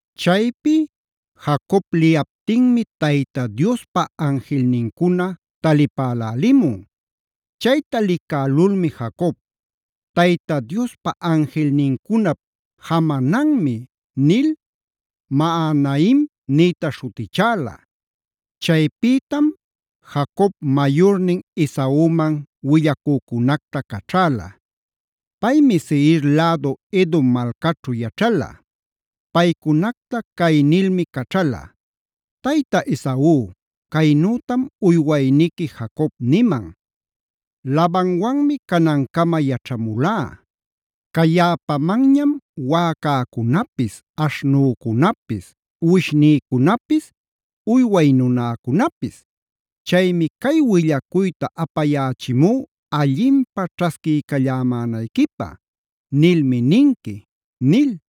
Chaypi Jacob liyaptinmi Tayta Diospa anjilnincuna talipälälimun. Chayta licälulmi Jacob: “Tayta Diospa anjilnincunap jamananmi” nil Mahanaim nïta śhutichäla. Chaypïtam Jacob mayurnin Esauman willacücunacta caćhäla. Paymi Seir lädu Edom malcaćhu yaćhala. Paycunacta cay nilmi caćhala: “Tayta Esau, caynütam uywayniqui Jacob niman: Labanwanmi canancama yaćhamulá. Cayäpamanñam wäcäcunapis, aśhnücunapis, uwishnïcunapis, uyway nunäcunapis. Chaymi cay willacuyta apayächimú allinpä ćhasquiycallämänayquipä, nilmi ninqui” nil.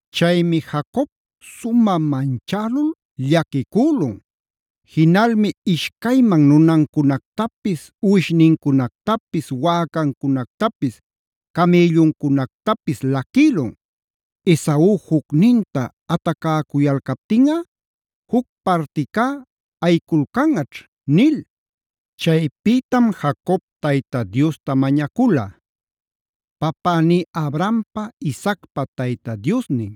Chaymi Jacob sumä manchälul llaquicülun; jinalmi ishcayman nunancunactapis, uwishnincunactapis, wäcancunactapis, camïlluncunactapis laquïlun: “Esau jucninta atacäcuyalcaptinꞌa, juc particá ayiculcanꞌaćh” nil. Chaypïtam Jacob Tayta Diosta mañacula: “Papäní Abrahampa Isaacpa Tayta Diosnin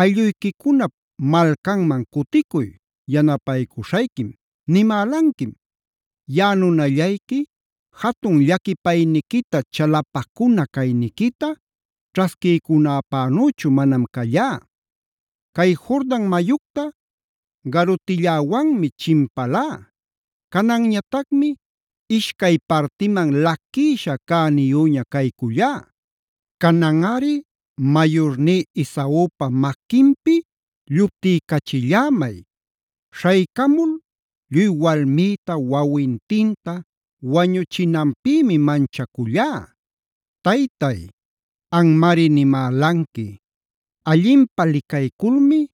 ‘aylluyquicunap malcanman cuticuy, yanapaycuśhayquim’ nimälanquim. Yaꞌa nunallayqui jatun llaquipayniquita chalapacuna cayniquita ćhasquiycunäpänüchu manam callá. Cay Jordan mayucta garutilläwanmi chinpalá; cananñatacmi ishcay partiman laquïsha cäniyüña caycullá. Cananꞌari mayurní Esaupa maquinpi lluptiycachillämay. Śhaycamul lluy walmïta wawintinta wañuchinanpïmi manchacullá. Taytay, anmari nimälanqui: ‘Allinpä licayculmi,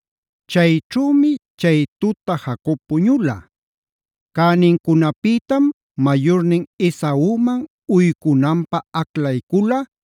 Chayćhümi chay tuta Jacob puñula. Cänincunapïtam mayurnin Esauman uycunanpä aclaycula: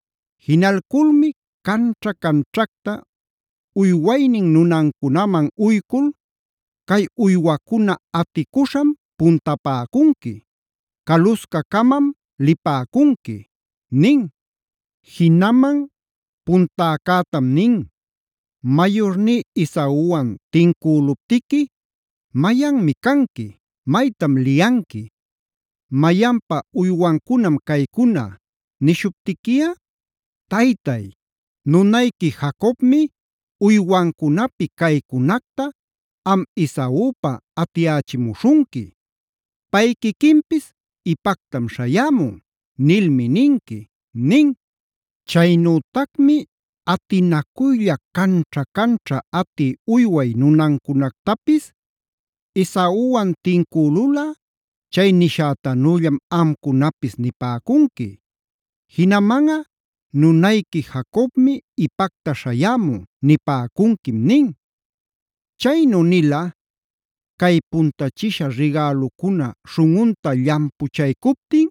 Jinalculmi canćha-canćhacta uywaynin nunancunaman uycul: “Cay uywacuna aticuśham puntapäcunqui. Caluscacamam lipäcunqui” nin. Jinaman puntäcätam nin: Mayurní Esauwan tincüluptiqui: “¿Mayanmi canqui? ¿Maytam liyanqui? ¿Mayanpa uywancunam caycuna? nishuptiquiꞌa: ‘Taytay, nunayqui Jacobmi uywancunapi caycunacta am Esaupa atiyächimuśhunqui. Pay quiquinpis ipactam śhayämun’ nilmi ninqui” nin. Chaynütacmi atinacuylla canćha-canćha atï uyway nunancunactapis: “Esauwan tincülulꞌa chay nishätanüllam amcunapis nipäcunqui. Jinamanꞌa ‘nunayqui Jacobmi ipacta śhayämun’ nipäcunquim” nin. Chaynu nila: “Cay puntachisha rigälucuna śhunꞌunta llampuchaycuptin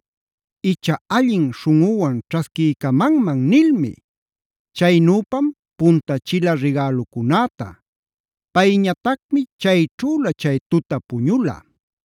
icha allin śhunꞌuwan ćhasquiycamanman” nilmi. Chaynüpam puntachila rigälucunäta. Payñatacmi chayćhüla chay tuta puñula.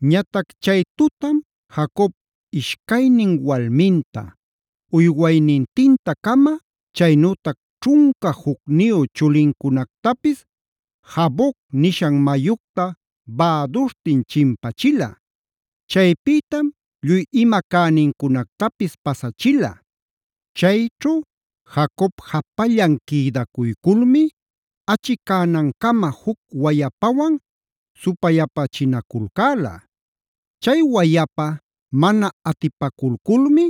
Ñatac chay tutam Jacob ishcaynin walminta, uywaynintinta-cama, chaynütac ćhunca jucniyu chulincunactapis Jaboc nishan mayucta bäduśhtin chinpachila. Chaypïtam lluy ima cänincunactapis pasachila. Chayćhu Jacob japallan quïdacuyculmi achicänancama juc wayapawan supayapachinaculcäla. Chay wayapa mana atipaculculmi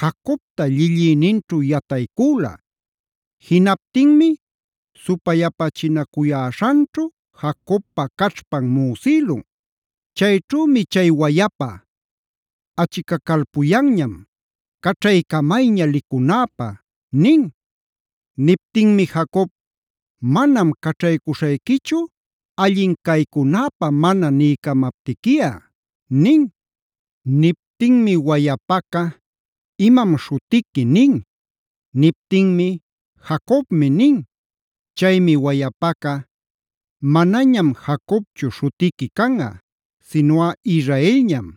Jacobta llillïninćhu yataycüla. Jinaptinmi supayapachinacuyäśhanćhu Jacobpa caćhpan müsïlun. Chayćhümi chay wayapa: “Achicacalpuyanñam caćhaycamayña licunäpä” nin. Niptinmi Jacob: “Manam caćhaycuśhayquichu allin caycunäpä mana niycamaptiquiꞌa” nin. Niptinmi wayapaca: “¿Imam śhutiqui?” nin. Niptinmi: “Jacobmi” nin. Chaymi wayapaca: “Manañam Jacobchu śhutiqui canꞌa. Sinuꞌa Israelñam,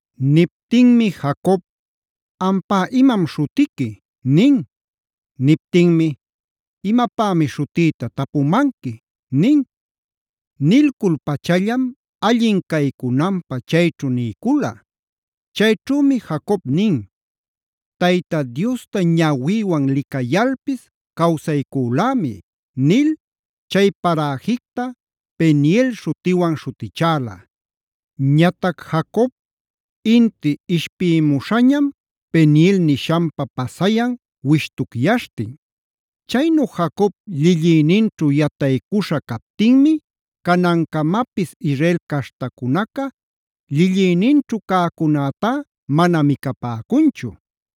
Niptinmi Jacob: “Ampá ¿imam śhutiqui?” nin. Niptinmi: “Imapämi śhutïta tapumanqui” nin. Nilcul-pachallam allin caycunanpä chayćhu niycula. Chayćhümi Jacob nin: Tayta Diosta ñawïwan licayalpis cawsaycülämi” nil chay paräjicta Penielc śhutiwan śhutichäla. Ñatac Jacob inti ishpïmuśhañam Peniel nishanpa pasayan wishtucyaśhtin. Chaynu Jacob llillïninćhu yataycuśha captinmi canancamapis Israel caśhtacunaca llillïninćhu cäcunätá mana micapäcunchu.